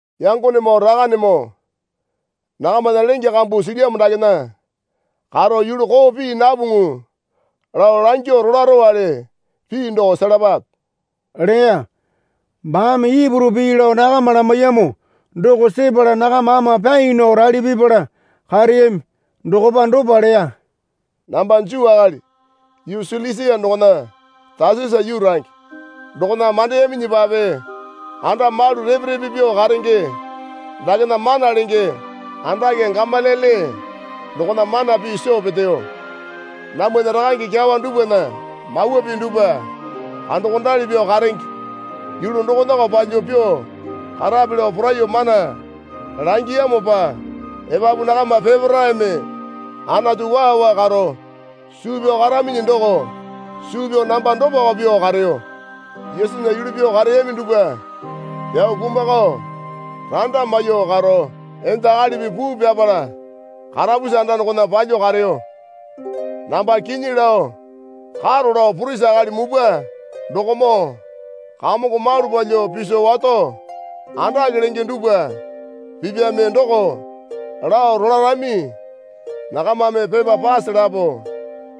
Yangonemoo, Rakanemoo, nakamana lenge kambu silyamo dakena karo yulu koo pii napuŋu lao langyuo rolarowale pii doko selapape leya. Baame Ipuru pii lao nakama lamaiyamo doko sepala nakama ama pyai nao rali pipala kareyami. Dokopa dopa leya. Namba Juu akali yuu Silisia dokona Tasasa yuu range. Dokona mandeyaminyipape anda malu repe repe pyuo karenge dakena mana lenge andake Gamaliele dokona mana pii soo peteyo. Namwana rakange kyawa dupwana Mawa Pii dupwa kandokondali pyuo karenge yulu dokonako palyuo pyuo karape lao poraiyuo mana langiyamopa epapu nakama peparaeme Anatu waa waa karo suu pyao karaminyi doko suu pyao namba dopako pyuo kareyo. Yesunya yulu pyuo kareyami dupwa pyao kumakao randa maiyuo karo enda akalipi puu pyapala karapusi anda dokona palyuo kareyo. Namba kinyi lao karo lao purisi akali mupwa dokomoo kamongo malu palyuo piso wato andake lenge dupwa pipyame doko lao rolarami. Nakamame pepa pase lapo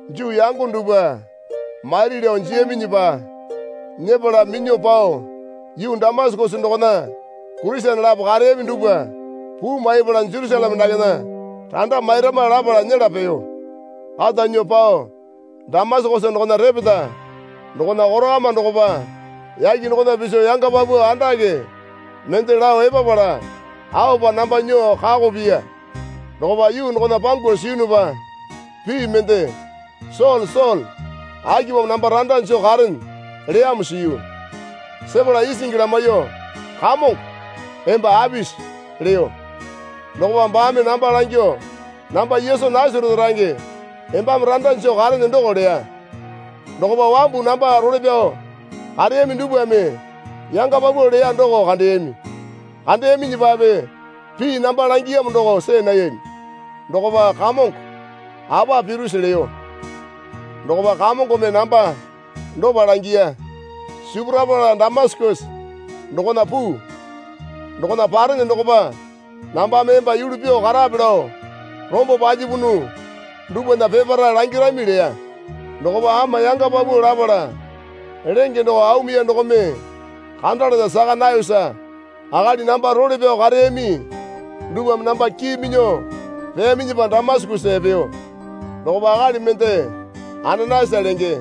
Juu yango dupwa mairi lao jiyaminyipa nyepala minyuo pao yuu Damasakesa dokona Kurisene lapo kareyami dupwa puu maipala Jerusaleme dakena randa mairama lapala nyela peyo. Kata nyuo pao Damasakesa dokona repeta dokona korakama dokopa yake dokona piso yanga paupau andake mende lao epapala aopa namba nyuo kako piya. Dokopa yuu dokona pangu siyunupa pii mende, Sole, Sole, akipamo namba randa joo karene? leyamo siyu. Sepala isingi lamaiyuo, Kamongo, emba apisi? leyo. Dokopa baame namba langyuo, Namba Yesu Nasarete range embame randa joo karene doko leya. Dokopa wambu namba role pyao kareyami dupwame yanga paupau leya doko kandeyami. Kandeyaminyipape pii namba langiyamo doko see nayami. Dokopa, Kamongo, apa pirose? leyo. Dokopa Kamongome namba dopa langiya. Sipurapala Damasakesa dokona puu. Dokona parene dokopa nambame emba yulu pyuo karape lao rombo palyapunu dupwana peparae langirami leya. Dokopa ama yanga paupau lapala lenge doko aumuya dokome kandalana saka nayosa akali namba role pyao kareyami dupwame namba kii minyuo peyaminyipa Damasakesa epeyo. Dokopa akali mende Ananayasa lenge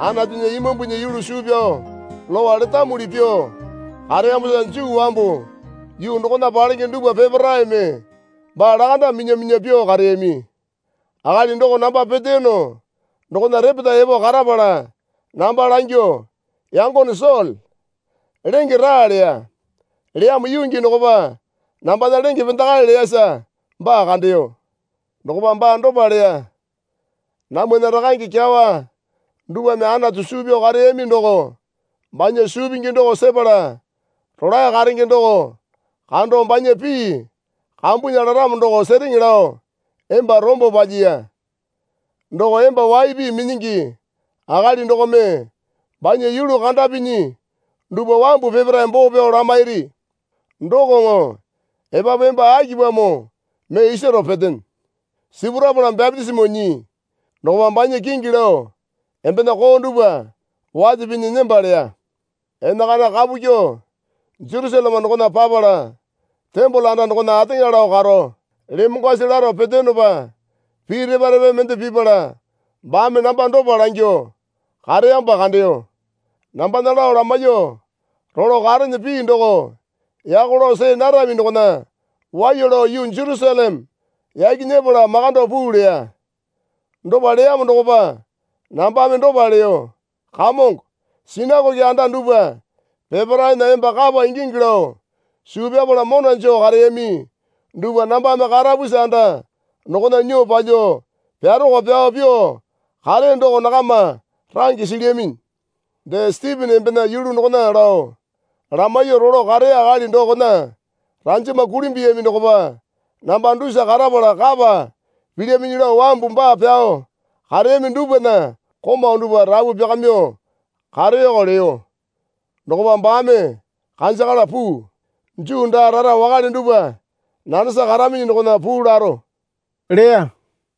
Anatunya Imambunya yulu suu pyao Lowa letamuli pyuo kareyamosa Juu wambu yuu dokona palenge dupwa peparaeme baa lakanda minya minya pyuo kareyami. Akali doko namba peteyono dokona repeta epo karapala namba langyuo, Yangone Sole, lenge raa, leya. Leyamo yuu gii dokopa nambana lenge pendakae leyasa baa kandeyo. Dokopa baa dopa leya. Namwana rakange kyawa dupwame Anatu suu pyao kareyami doko banya suu pingi doko sepala Rolae Karenge doko kando banya pii kambunya laramo doko sereŋe lao emba rombo palyiya. Doko emba waipi minyingi akali dokome banya yulu kandapinyi dupwa wambu peparae boo pyao lamairi. Dokoŋo epapu emba akipamo mee isaro petene? Sipurapala bapitisimo nyii. Dokopa banya kingi lao embena koo dupwa wate pinyi nemba leya. Enakana kapu kyuo Jerusaleme dokona papala tembole anda dokona ateŋa lao karo lemongwasi laro peteyonopa pii repa repa mende pipala baame namba dopa langyuo kareyamopa kandeyo. Nambana lao lamaiyuo rolo karene pii doko yako lao see narami dokona waiya lao yuu Jerusaleme yaki nyepala makando puu leya. Dopa leyamo dokopa nambame dopa leyo. Kamongo, sinakoke anda dupwa peparaena emba kapa ingingi lao suu pyapala mona joo kareyami dupwa nambame karapusi anda dokona nyuo palyuo pyaroko pyao pyuo kareyo doko nakama range silyaminyi. Dee Sitipena embena yulu dokona lao lamaiyuo rolo kareya akali dokona ranjama kulimbuyami dokopa namba dusa karapala kapa pilyaminyi lao wambu baa pyao kareyami dupwana komau dupwa rapu pyakamyuo kareyoko leyo. Dokopa baame, Kanjakala puu. Juu daa rara wakale dupwa nanesa karaminyi dokona puu laro, leya.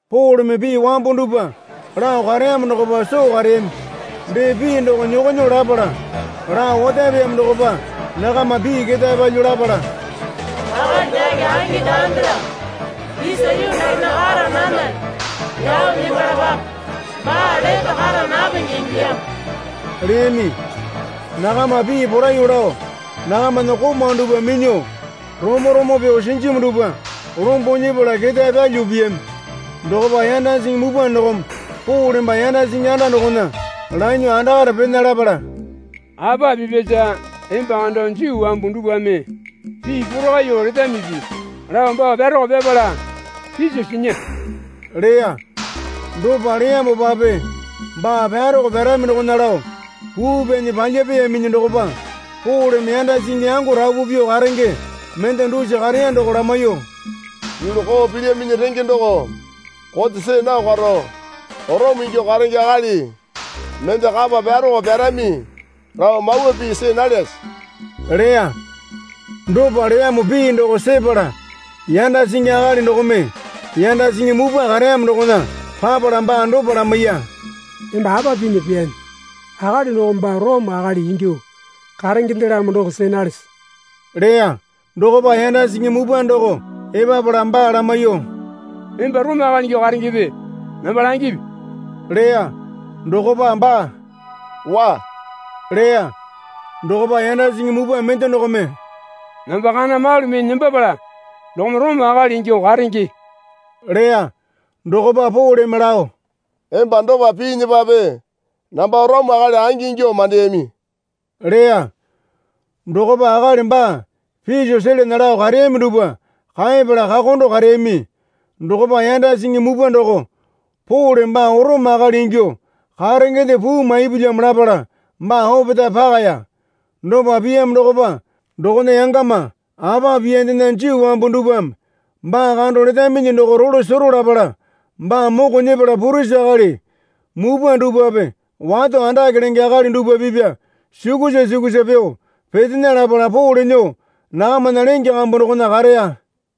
Poleme pii wambo dupwa lao kareyamo dokopa soo kareyami. Dee pii doko nyokonyuo lapala lao otapeyamo dokopa nakama pii ketae palyuo lapala, Akali dake angi daandelamo, isa yuu dakena kara nanale, pyao nembalapape. Baa lete kara napenge ingilyamo leyami. Nakama pii poraiyuo lao nakamana komau dupwa minyuo romo romo pyuo sinjimu dupwa lombo nyepala ketae pyalyuo piyami. Dokopa yanda singi mupwa dokome Pole baa yanda singi anda dokona lanyuo andakare pena lapala, Apa pipyasa emba kando Juu wambu dupwame pii porakaiyuo letamipi? lao baa pyaroko pyapala piso sinya leya. Dopa leyamopape baa pyaroko pyarami dokona lao puu pyanyi palyapeyaminyi dokopa Poleme yanda singi yango rapu pyuo karenge mende dusa kareya doko lamaiyuo, Yulu koo pilyaminyi renge doko kote see nao karo Orome ingyuo karenge akali mende kapa pyaroko pyarami lao mawa pii see nalyase? leya. Dopa leyamo pii doko sepala yanda singi akali dokome yanda singi mupwa kareyamo dokona papala baa dopa lamaiya. Emba apa pinya pyaane? Akali doko baa Orome akali ingyuo karengendelamo doko see nalese? leya. Dokopa yanda singi mupwa doko epapala baa lamaiyuo, Emba Orome akali ingyuo karengepe? namba langipi leya. Dokopa baa, Waa leya. Dokopa yanda singi mupwa mende dokome, Namba kana malu mee nembapala dokome Orome akali ingyuo karenge, leya. Dokopa Poleme lao, Emba dopa piinyipape namba Orome akali angi ingyuo mandeyami leya. Dokopa akali baa piso selana lao kareyami dupwa kaepala kakondo kareyami. Dokopa yanda singi mupwa doko Pole baa Orome akali ingyuo karengende puu maipulyamo lapala baa opetae pakaya. Dopa piyamo dokopa dokona yangama apa piyandena Juu wambu dupwame baa kando letaminyi doko rolo sero lapala baa moko nyepala purisi akali mupwa dupwape wato andake lenge akali dupwa pipya sukusa sukusa pyuo petena lapala Pole nyuo nakamana lenge kambu dokona kareya.